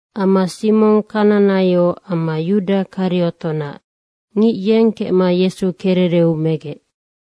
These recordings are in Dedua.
Amma Simong Kananaio amma Yuda Kariotonac. Ngic yeng kecma Yesu kerereu megec.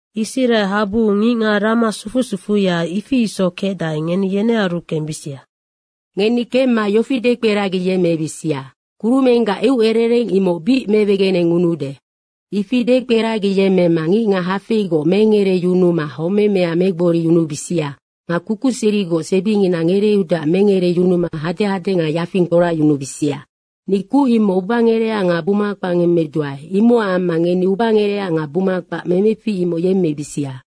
Israehabuu ngicngac rama sufu sufuya, ifi isoc kecdae, ngeni yenearu kembisia. Ngeni kemma yofi dekperagiyemmebisia, kurumenggac eucerereng imoc bic mewegenengunude. Ifi dekperagiyemmemma ngicngac hafeigoc mengereyunuma homemea megboriyunubisia nga kukuserigoc sebingina ngereeudeac mengereyunuma hadehade nga yafing kporacyunubisia. Ni kuc imoc ubangerecac nga buma kpac ngemmedua, imocac amma ngeni ubangerecac nga buma kpac memefic imoc yemmebisia.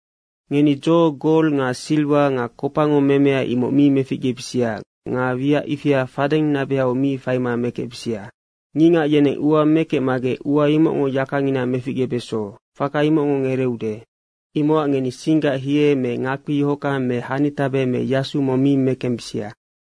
Ngeni dzo gol nga siriwa nga kopango memea, imoc mi meficgebisia nga wiac ifia fadeng nabehau mi faima mekecbisia. Ngicngac yeneng ua mekecmagec ua imocngo yakangina meficgebeso, faka imoc ngereeude. Imocac ngeni singgac hie me ngakpi yohockang me hanitabe me yasu mong mi mekembisia.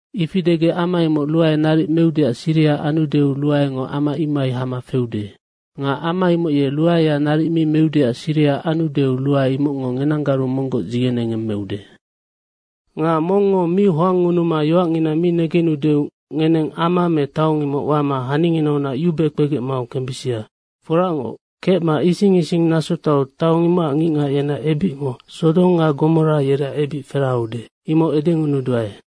Ifi degec ama imoc ruae naric meudeac siriha anudeu, ruaengo ama imohai hama feude. Nga ama imoc ye ruaea naric mi meudeac siriha anudeu ruae imocngo ngenanggaru monggoc dzigenengemmeude. Nga mongngo mi hoangngunuma yoacngina mi negenudeu ngeneng ama me taong imoc wama haninginaunac yube kpegec mau kembisia. Foracngoc, kecma ising ising nasotoau taong imocac ngicngac yeneac ebicngo Sodong nga Gomora taong, yereac ebic feraheude, imoc edengunuduae.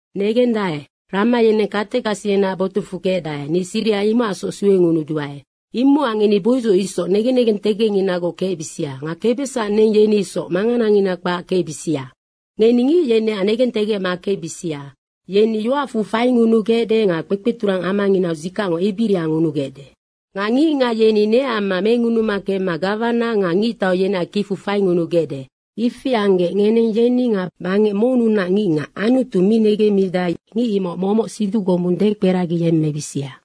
Negendae, rama yeneng katekasi yeneac botucfu kecdae, ni siriha imocacsoc suengunuduae. Imocac ngeni boidzoc isoc negen negentegecnginagoc kecbisia nga kebesac neng, yeni isoc manganangina kpac kecbisia. Ngeni ngic yeneac negentegecma kecbisia. Yeni yoacfu faingunugecde nga kpekpeturang amanginau dzikacngo ebiria ngunugecde. Nga ngicngac yeni neac amma mengunuma kemma gawana nga ngictau yeneac kicfu faingunugecde. Ifi anggec ngeneng yeni nga bangec monnunac ngicngac Anutu mi negendae, ngic imoc momoc siduc gombung dekperagiyemmebisia.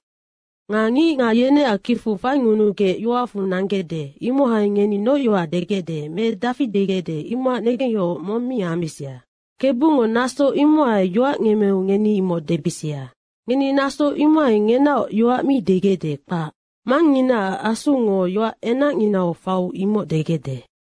Nga ngicngac yeneac kicfu faingunugec yoacfu nanggecde, imohai ngeni noc yoac degecde me dafi degecde, imocac negengyohoc mong mi ambisia. Kebungo naso imohainoc yoac ngemmeu ngeni imoc debisia. Ngeni naso imohai ngenaoc yoac mi degecde, kpac. Mangnginaac Asungo yoac enacnginau faiu imoc degecde.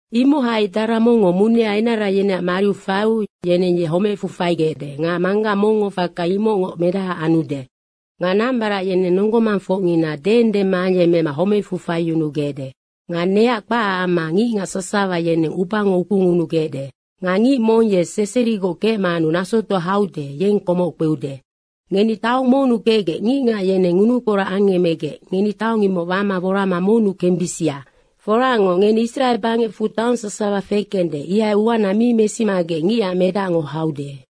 Imohai dara mongngo munea enara yeneac mariu faiu yeneng ye homecfu faigecde nga manggac mongngo faka imocngoc medahaac anude. Nga nambarac yeneng nonggo mangfocngina deengdema ayemmema homecfu faiyunugecde. Nga neac kpacac amma ngicngac sasawa yeneng ubango ukungunugecde. Nga ngic mong ye seserigoc kecmanu nasotoa haude, yeng komoc kpeude. Ngeni taong monnu kecgec ngicngac yeneng ngunukporac angemmegec ngeni taong imoc wama worama monnu kembisia. Foracngoc, ngeni Israe bangecfu taong sasawa fekende, ihai uana mi mesimagec Ngicac Medacngo haude.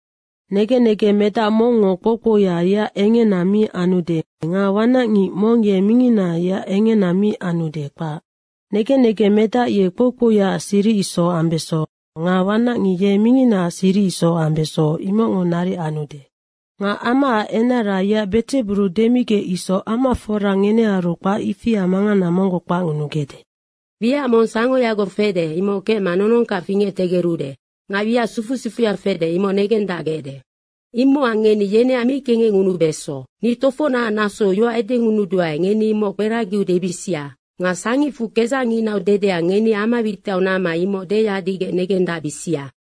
Negen negeng medac mongngo kpoukpouya yeac engena mi anude nga wanacngic mong ye mingina yeac engena mi anude, kpac. Negen negeng medac ye kpoukpouyaac siric isoc ambeso nga wanacngic ye minginaac siric isoc ambeso, imocngo naric anude. Nga amaac enara yeac Bedzeburu demigec isoc amafora ngenearu kpac ifia mangana monggoc kpacngunugecde. Wiac mong sangoyagoc fede, imoc kecma nonongkac fingectegerude nga wiac sufu sufuya fede, imoc negendacgecde. Imocac ngeni yeneac mi kengecngunubeso. Ni tofocnac nasou yoac edengunuduae, ngeni imoc kperagiau debisia. Nga sangicfu kedzacnginau dedea, ngeni ama witiau namma imoc deyadigec negendacbisia.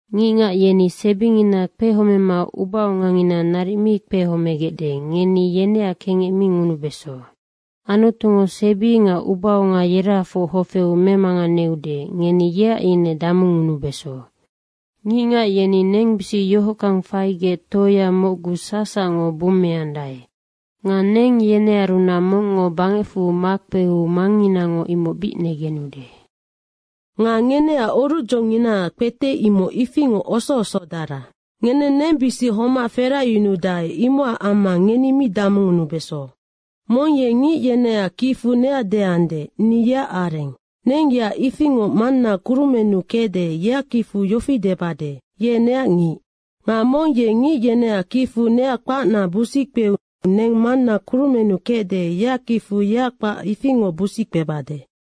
Ngicngac yeni sebingina kpehomema ubaongangina naric mi kpehomegecde, ngeni yeneac mi kengecngunubeso. Anutungo sebi nga ubaonga yerahafoc hofeu memanganeude, ngeni yeac ine damungunubeso. Ngicngac yeni nengbisic yohockang faigec toea mocgu sacsacngo bummeandae. Nga neng yenearunac mongngo bangecfu makpeu Mangnginango imoc bic negenude. Nga ngeneac orucdzonginaac kpete, imoc ifingoc osoosodara. Ngeneng nengbisic homac feracyunudae, imocac amma ngeni mi damungunubeso. Mong ye ngic yeneac kicfu neac deande, ‘Ni yeac areng.’ Neng yeac ifingoc Manna kurumennu kecde, yeac kicfu yofi debade, ‘Ye neac ngic.’ Nga mong ye ngic yeneac kicfu neac kpacna busickpeu neng Manna kurumennu kecde, yeac kicfu yeac kpac ifingoc busic kpebade.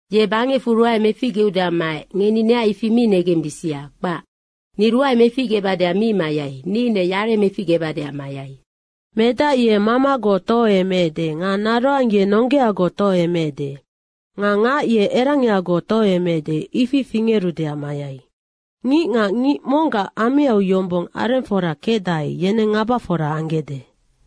‘Ye bangecfu ruae meficgeudeac maec.’ ngeni neac ifi mi negembisia, kpac. Ni ruae meficgebadeac mi mayai, ni ine yare meficgebadeac mayai. ‘Medac ye mamagoc tohoemeecde nga naroang ye nonggeagoc tohoemeecde. Nga ngac ye erangiagoc tohoemeecde, ifi fingerudeac mayai. Ngicngac ngic monggac ameau yombong arengfora kecdae, yenennoc ngabafora anggecde.’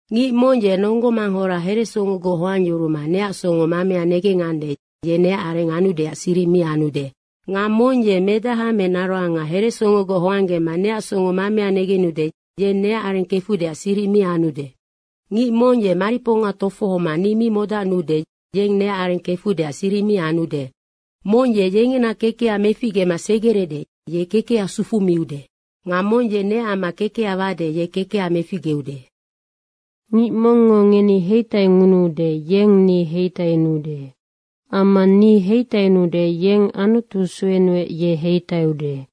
Ngic mong ye nonggo manghora heresongogoc hoangyuruma neac songo mamea negengande, ye neac areng anudeac siric mi anude. Nga mong ye medaha me naroanga heresongogoc hoanggema neac songo mamea negenude, yeng neac areng kefudeac siric mi anude. Ngic mong ye mariponga tofohoma ni mi modacnuude, yeng neac areng kefudeac siric mi anude. Mong ye yengena kekeha meficgema segerede, ye kekeha sufumiude. Nga mong ye neac amma kekeha wade, ye kekeha meficgeude. Ngic mongngo ngeni heitaingunuude, yeng ni heitainuude. Amma ni heitainuude, yeng Anutu suenuec, ye heitaiude.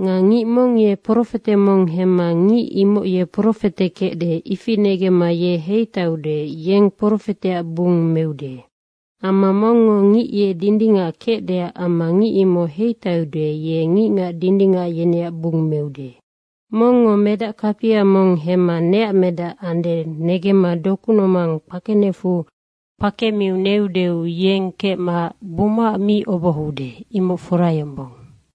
Nga ngic mong ye profete mong hemma ngic imoc ye profete kecde, ifi negemma ye heitaiude, yeng profeteac bung meude. Amma mongngo ngic ye dindingac kecdeac amma ngic imoc heitaiude, ye ngicngac dindingac yeneac bung meude. Mongngo medac kapia mong hemma neac medac andeac negemma doku nomang kpakenecfu kpemiu neudeu yeng kecma bumaac mi obohoude, imoc fora yombong.”